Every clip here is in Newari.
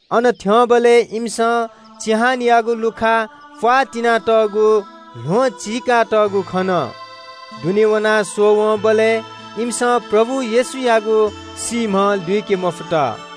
अन थ्‍यंबलय् इमिसं चिहानयागु लुखा प्‍वाः तिनातःगु ल्‍वहं चीकातःगु खन। दुने वनाः स्‍वःवंबलय् इमिसं प्रभु येशूयागु सीम्‍ह लुइके मफुत।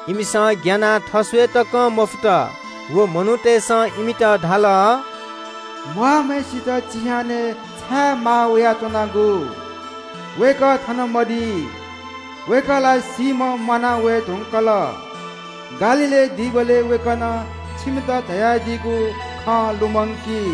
इमिसं ग्‍यानाः थस्‍वये तकं मफुत। व मनूतय्‌सं इमित धाल – “म्‍वाःम्‍हय्‌सित चिहानय् छाय् माः वयाच्‍वनागु? वय्‌कः थन मदी। वय्‌कः ला सीम्‍हं म्‍वाना वये धुंकल। गालीलय् दीबलय् वय्‌कलं छिमित धयादीगु खँ लुमंकी –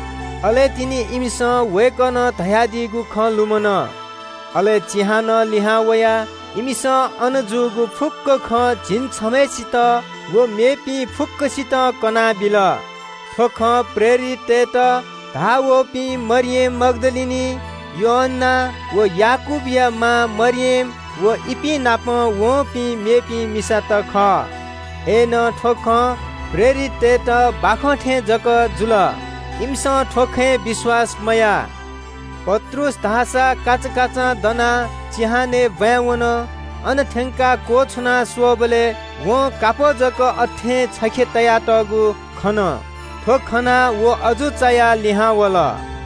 अले तिनि इमिसं वय्‌कलं धयादीगु खँ लुमन। अले चिहानं लिहां वयाः इमिसं अन जूगु फुक्‍क खँ झिंछम्‍हय्‌सित व मेपिं फुक्‍कसितं कनाबिल। थ्‍व खँ प्रेरिततय्‌त धाः वःपिं मरियम मग्‍दलिनी, योअन्‍ना व याकूबया मां मरियम व इपिं नाप वंपिं मेपिं मिसात खः। अय्‌नं थ्‍व खँ प्रेरिततय्‌त बाखं थें जक जुल, इमिसं थ्‍व खँय् विश्‍वास मयाः। पत्रुस धाःसा काचाकाचां दनाः चिहानय् ब्‍वाँय् वन। अन थ्‍यंकाः क्‍वछुनाः दुने स्‍वःबलय् वं कापः जक अथें छखे तयातःगु खन। थ्‍व खनाः व अजू चायाः लिहां वल।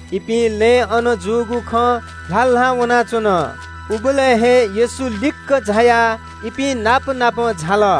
इपिं लँय् अन जूगु खँ ल्‍हाल्‍हां वनाच्‍वन। उबलय् हे येशू लिक्‍क झायाः इपिं नाप नाप झाल।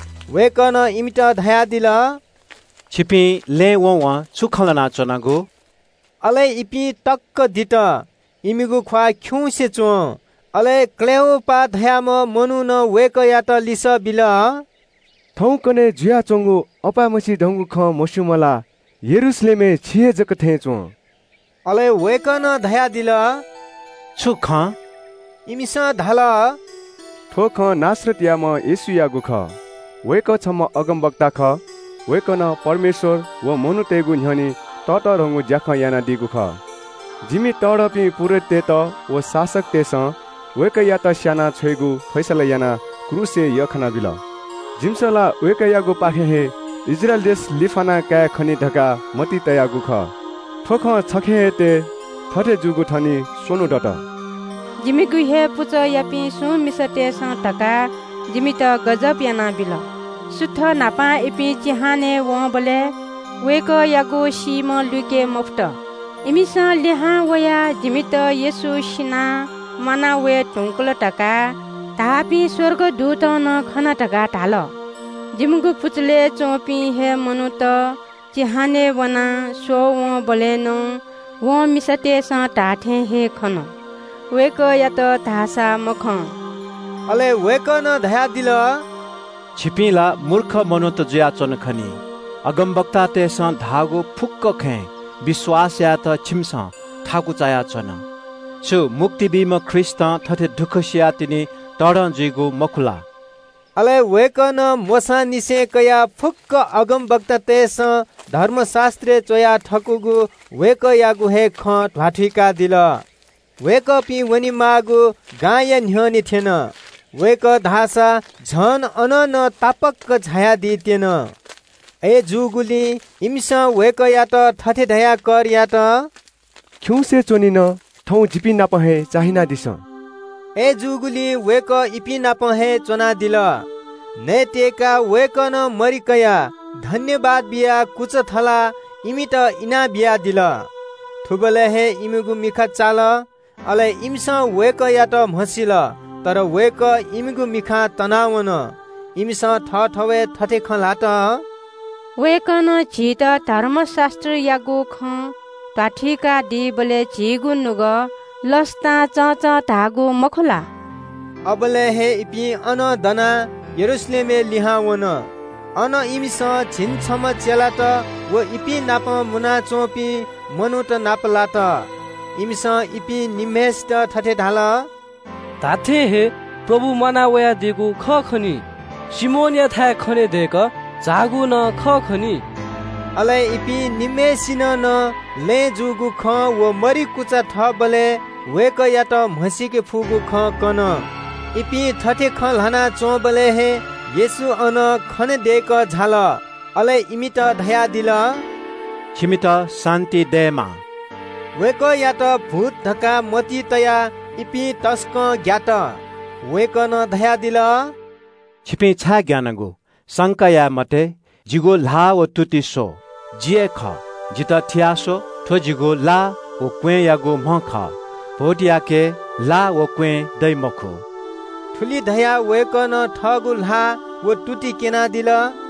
वय्‌कलं इमित धयादिल – “छिपिं लँय् व वं छु खँ ल्‍हाना च्‍वनागु?” अले इपिं तक्‍क दित। इमिगु ख्‍वाः खिउँसे च्‍वं। अले क्‍लेओपास धाःम्‍ह मनुखं वय्‌कःयात लिसः बिल – “थौंकन्‍हय् जुयाच्‍वंगु अपाय्‌मछि धंगु खँ मस्‍यूम्‍ह ला यरूशलेमय् छि हे जक थें च्‍वं?” अले वय्‌कलं धयादिल – “छु खँ?” इमिसं धाल – “थ्‍व खँ नासरतयाम्‍ह येशूयागु खः। वय्‌कः छम्‍ह अगमवक्ता खः। वय्‌कलं परमेश्‍वर व मनूतय्‌गु न्‍ह्यःने ततःधंगु ज्‍याखँ यानादीगु खः। जिमि तःधंपिं पुजाहारीत व शासकतय्‌सं वय्‌कःयात स्‍याना छ्वयेगु फैसला यानाः क्रूसय् यख्‍खानाबिल। जिमिसं ला वय्‌कःयागुपाखें हे इस्राएल देश लिफ्‍याना कायेखनी धकाः मतिइ तयागु खः। थ्‍व खँ छखे हे तये। थथे जूगु थनिं स्‍वन्‍हु दत। “जिमिगु हे पुचःयापिं सुं मिसातय्‌सं धकाः जिमित गजब यानाबिल। सुथ न्‍हापां इपिं चिहानय् वंबलय् वय्‌कःयागु सीम्‍ह लुइके मफुत। इमिसं लिहां वयाः जिमित ‘येशू सिनाः म्‍वाना वये धुंकल’ धकाः धाःपिं स्‍वर्गदूतत नं खना धकाः धाल। जिमिगु पुचलय् च्‍वंपिं हे मनूत चिहानय् वनाः स्‍वःवंबलय् नं व मिसातय्‌सं धाःथें हे खन, वय्‌कःयात धाःसा मखं।” अले वय्‌कलं धयादिल – “छिपिं ला मूर्ख मनूत जुयाच्‍वन खनी। अगमवक्तातय्‌सं धाःगु फुक्‍क खँय् विश्‍वास यायेत छिमिसं थाकु चायाच्‍वन। छु मुक्ति बीम्‍ह ख्रीष्‍टं थथे दुःख सियाः तिनि तःधं जुइगु मखु ला?” अले वय्‌कलं मोशांनिसें कयाः फुक्‍क अगमवक्तातय्‌सं धर्मशास्‍त्रय् च्‍वया थकूगु वय्‌कःयागु हे खँ ध्‍वाथुइकादिल। वय्‌कःपिं वनेमाःगु गांया न्‍ह्यःने थ्‍यन। वय्‌कः धाःसा अझ अनं नं तापाक झायादी त्‍यन। अय्‌नं इमिसं वय्‌कःयात थथे धयाः कर यात – “खिउँसे च्‍वनीन, थौं जिपिं नाप हे चाहिनादिसँ।” अय्‌जूगुलिं वय्‌कः इपिं नाप हे च्‍वनादिल। नयेत्‍यय्‌काः वय्‌कलं मरि कयाः सुभाय् बियाः कुचा थलाः इमित इनाबियादिल। थुबलय् हे इमिगु मिखा चाल, अले इमिसं वय्‌कःयात म्‍हसिल। अय्‌नं वय्‌कः इमिगु मिखां तनावन। इमिसं थःथवय् थथे खँ ल्‍हात – “वय्‌कलं झीत धर्मशास्‍त्रयागु खँ ध्‍वाथुइकादीबलय् झीगु नुगः लसतां चंचं धाःगु मखु ला?” अबलय् हे इपिं अनं दनाः यरूशलेमय् लिहां वन। अन इमिसं झिंछम्‍ह चेलात व इपिं नाप मुनाच्‍वंपिं मनूत नापलात। इमिसं इपिं निम्‍हय्‌सित थथे धाल – “धात्‍थें हे, प्रभु म्‍वाना वयादीगु खः खनी। सिमोनयाथाय् खनेदय्‌कः झाःगु नं खः खनी।” अले इपिं निम्‍हय्‌सिनं नं लँय् जूगु खँ व मरि कुचा थःबलय् वय्‌कःयात म्‍हसीके फुगु खँ कन। इपिं थथे खँ ल्‍हाना च्‍वंबलय् हे येशू अन खनेदय्‌कः झाल। अले इमित धयादिल – “छिमित शान्‍ति दयेमा।” वय्‌कःयात भूत धकाः मतिइ तयाः इपिं तसकं ग्‍यात। वय्‌कलं धयादिल – “छिपिं छाय् ग्‍यानागु? संका याये मते। जिगु ल्‍हाः व तुति स्‍व, जि हे खः, जितः थिया स्‍व, थ्‍व जिगु ला व क्‍वँय्‌यागु म्‍ह खः। भूतयाके ला व क्‍वँय् दइ मखु।” थुलि धयाः वय्‌कलं थःगु ल्‍हाः व तुति क्‍यनादिल।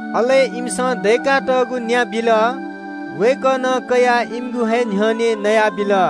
अले इमिसं दय्‌कातःगु न्‍या बिल। वय्‌कलं कयाः इमिगु हे न्‍ह्यःने नयादिल।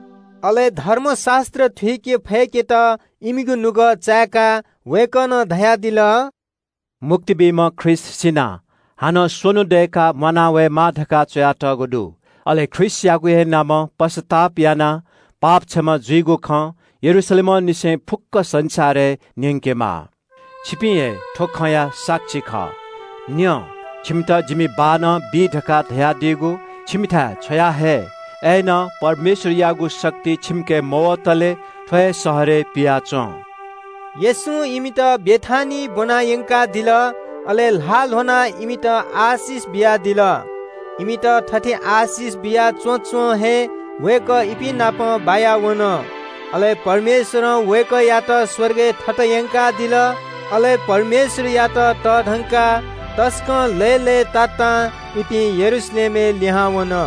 अले धर्मशास्‍त्र थुइके फय्‌केत इमिगु नुगः चाय्‌काः वय्‌कलं धयादिल – “मुक्ति बीम्‍ह ख्रीष्‍ट सिनाः हानं स्‍वन्‍हु दय्‌काः म्‍वाना वयेमाः धकाः च्‍वयातःगु दु। अले ख्रीष्‍टयागु हे नामं पश्‍चाताप यानाः पाप क्षमा जुइगु खँ यरूशलेमंनिसें फुक्‍क संसारय् न्‍यंकेमाः। छिपिं हे थ्‍व खँया साक्षी खः। “न्‍यँ, छिमित जिमि बाःनं बी धकाः धयादीगु छिमिथाय् छ्वयाहये। अय्‌नं परमेश्‍वरयागु शक्ति छिमिके मवतले थ्‍व हे शहरय् पियाच्‍वँ।” येशूं इमित बेथानियाय् ब्‍वना यंकादिल। अले ल्‍हाः ल्‍ह्वनाः इमित आशिष बियादिल। इमित थथे आशिष बिया च्‍वँच्‍वं हे वय्‌कः इपिं नाप बायावन, अले परमेश्‍वरं वय्‌कःयात स्‍वर्गय् थत यंकादिल। अले परमेश्‍वरयात तःधंकाः तसकं लय्‌लय्‌तातां इपिं यरूशलेमय् लिहां वन।